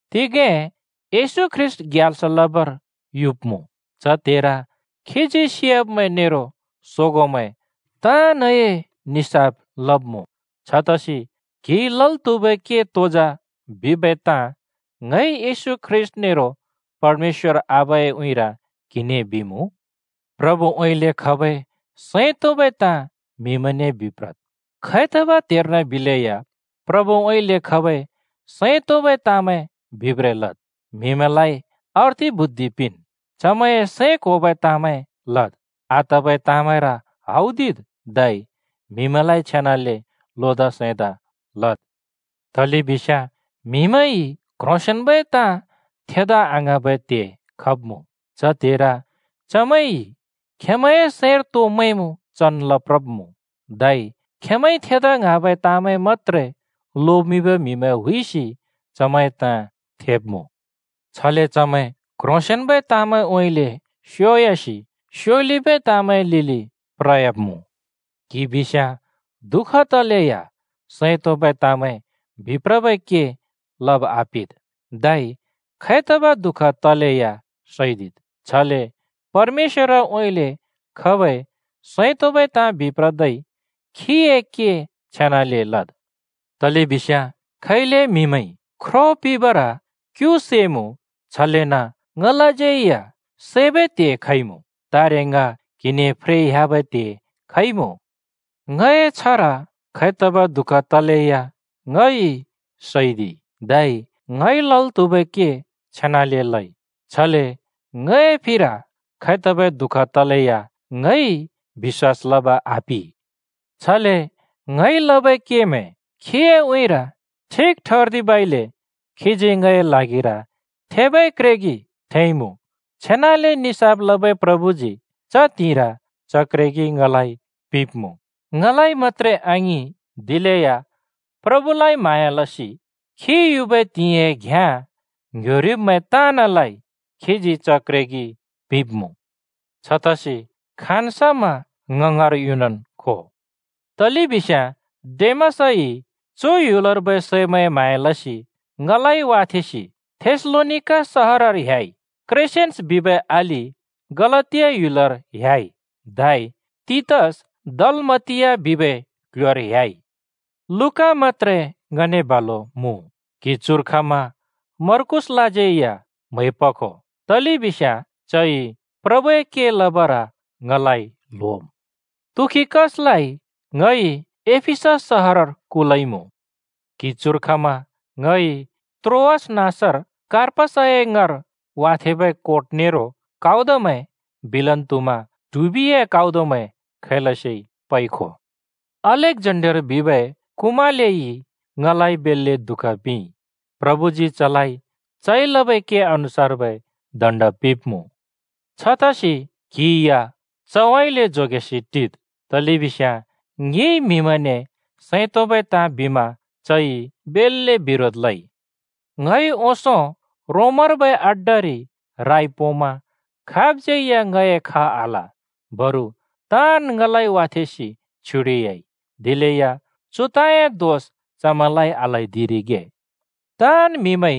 तिगें येशू ख्रीष्‍ट ग्याल्स लबर युब्‍मुँ। च त्हेर खीजी सियाब्‍मैं नेरो सोगोंमैं ताँनए निसाफ लब्‍मुँ। छतसि क्हिइ लल् त्हुबै के तो जा बिबै ताँ ङइ येशू ख्रीष्‍ट नेरो परमेश्‍वर आबाए उँइँर क्हिने बिमुँ। प्रभुउँइँले खबै सैं तोंबै ताँ म्हिमैंने बिप्रद्। खैतबै त्हर्न बिलैया प्रभुउँइँले खबै सैं तोंबै ताँमैं बिब्रें लद्। म्हिमैंलाइ अर्थि बुद्धि पिंन्। चमैंए सैं क्होबै ताँमैं लद्। आतबै ताँमैंर हौदिद् धै म्हिमैंलाइ छेनाले लोदा सैंदा लद्। तलेबिस्याँ म्हिमैंइ क्‍ह्रोंसेंन्‍बै ताँ थेदा आङ्हाँबै त्हे खब्मुँ। च त्हेर चमैंइ खेंमैंए सैंर तो मैंमुँ चन् लप्रब्मुँ। धै खेंमैंइ थेदा ङ्हाँबै ताँमैं मत्रै लोमिंबै म्हिमैं हुइसि चमैंए ताँ थेब्‍मुँ। छले चमैं क्‍ह्रोंसेंन्‍बै ताँमैंउँइँले स्योयासि स्योलिबै ताँमैंए लिलि प्रयाब्मुँ। क्‍हि बिस्याँ दुःख तलेया सैं तोंबै ताँमैं बिप्रबै के लब आपिद्। धै खैतबै दुःख तलेया सैदिद्, छले परमेश्‍वरउँइँले खबै सैं तोंबै ताँ बिप्रदै खीए के छेनाले लद्। तलेबिस्याँ खैले म्हिमैंइ ख्रो पिंबर क्यु सैमुँ, छलेन ङलाज्यै या सैबै त्हे खइमुँ, तारे ङ क्हिने फ्रेइ ह्‍याबै त्हे खइमुँ। ङए छ्हर खैतबै दुःख तलेया ङइ सैदिइ। धै ङइ लल् त्हुबै के छेनाले लइ। छले ङए फिर खैतबै दुःख तलेया ङइ बिश्‍वास लब आपि। छले ङइ लबै केमैं खीए उँइँर ठिक ठर्दिबइले खीजी ङए ल्हागिर थेबै क्रेगि थेंइमुँ। छेनाले निसाफ लबै प्रभुजी च त्हिंइर च क्रेगि ङलाइ पिंब्मुँ - ङलाइ मत्‍त्रे आङिं, दिलेया प्रभुलाइ म्हाँया लसि खी युबै त्हिंइए घ्‍याँ ङ्ह्‍योरिब्‍मैं ताँनलाइ खीजी च क्रेगि पिंब्‍मुँ। छतसि खाँन् समा ङ ङाँर युनन् खो। तलेबिस्याँ डेमासइ चु ह्‍युलर्बै सैमैंए म्हाँया लसि ङलाइ वाथेंसि थेसलोनिका सहरर ह्‍याइ। क्रेसेन्‍स बिबै अलि गलातिया ह्‍युलर ह्‍याइ, धै तीतस दलमातिया बिबै क्‍ल्‍ह्‍योर ह्‍याइ। लूका मत्‍त्रे ङने बालु मुँ। क्‍हि चुर खमा मर्कूसलाज्यै या म्है पखो, तलेबिस्याँ चइ प्रभुए के लबर ङलाइ ल्होम्। तुखिकसलाइ ङइ एफिसस सहरर कुलइमुँ। क्‍हि चुर खमा ङइ त्रोआस नाँसर कार्पसए ङाँर वाथेंबै कोट नेरो काउदमैं, बिलेन् त्हुमा ट्हुबिए काउदमैं खैलसे पइ खो। अलेक्‍जेन्डर बिबै कुमालेइ ङलाइ बेल्‍ले दुःख पिंइ। प्रभुजी चलाइ चइ लबै के अनुसार्बै दण्‍ड पिंब्‍मुँ। छतसि क्हि या चउँइँले जोगेसि टिद्, तलेबिस्याँ ङिइ म्हिमैंने सैं तोंबै ताँ बिमा चइ बेल्‍ले बिरोध लइ। ङइ ओंसों रोमर्बै अड्डारि राइ पोंमा खाबज्यै या ङए ख आल। बरु ताँन् ङलाइ वाथेंसि छ्युडिह्‍याइ। दिलेया चु ताँए दोष चमैंलाइ आल्हैदिरिगे। ताँन् म्हिमैंइ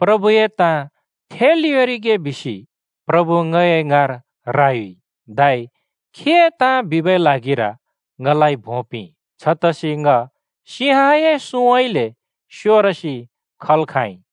प्रभुए ताँ थेल् योंरिगे बिसि प्रभु ङए ङाँर रायुइ, धै खीए ताँ बिबै ल्हागिर ङलाइ भों पिंइ। छतसि ङ सिंहए सुँउँइँले स्योरसि खल् खाँइ।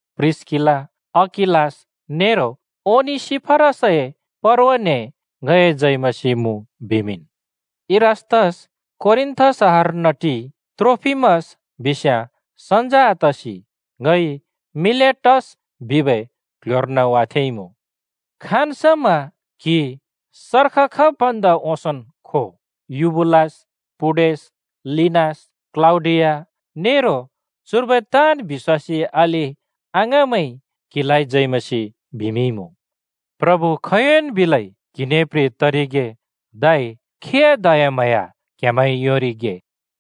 प्रिस्‍किला, अकिलास नेरो ओनेसिफरसए परवाने ङए जय मसीह मुँ बिमिंन्। इरास्‍तस कोरिन्‍थ सहरर्न टिइ, त्रोफिमस बिस्याँ सन्‍ज आतसि ङइ मिलेटस बिबै क्‍ल्‍ह्‍योर्न वाथेंइमुँ। खाँन् समा क्हि सर्ख खब् भन्दा ओंसोंन् खो। युबुलस, पुडेस, लिनस, क्‍लौडिया नेरो चुर्बै ताँन् बिश्‍वासी अलि-अङाँमैंइ क्हिलाइ जय मसीह बिमिंइमुँ। प्रभु खोंयोंन् बिलै क्‍हिने प्रे तरिगे। धै खीए दयाम्हाँया क्हेमैंइ योंरिगे।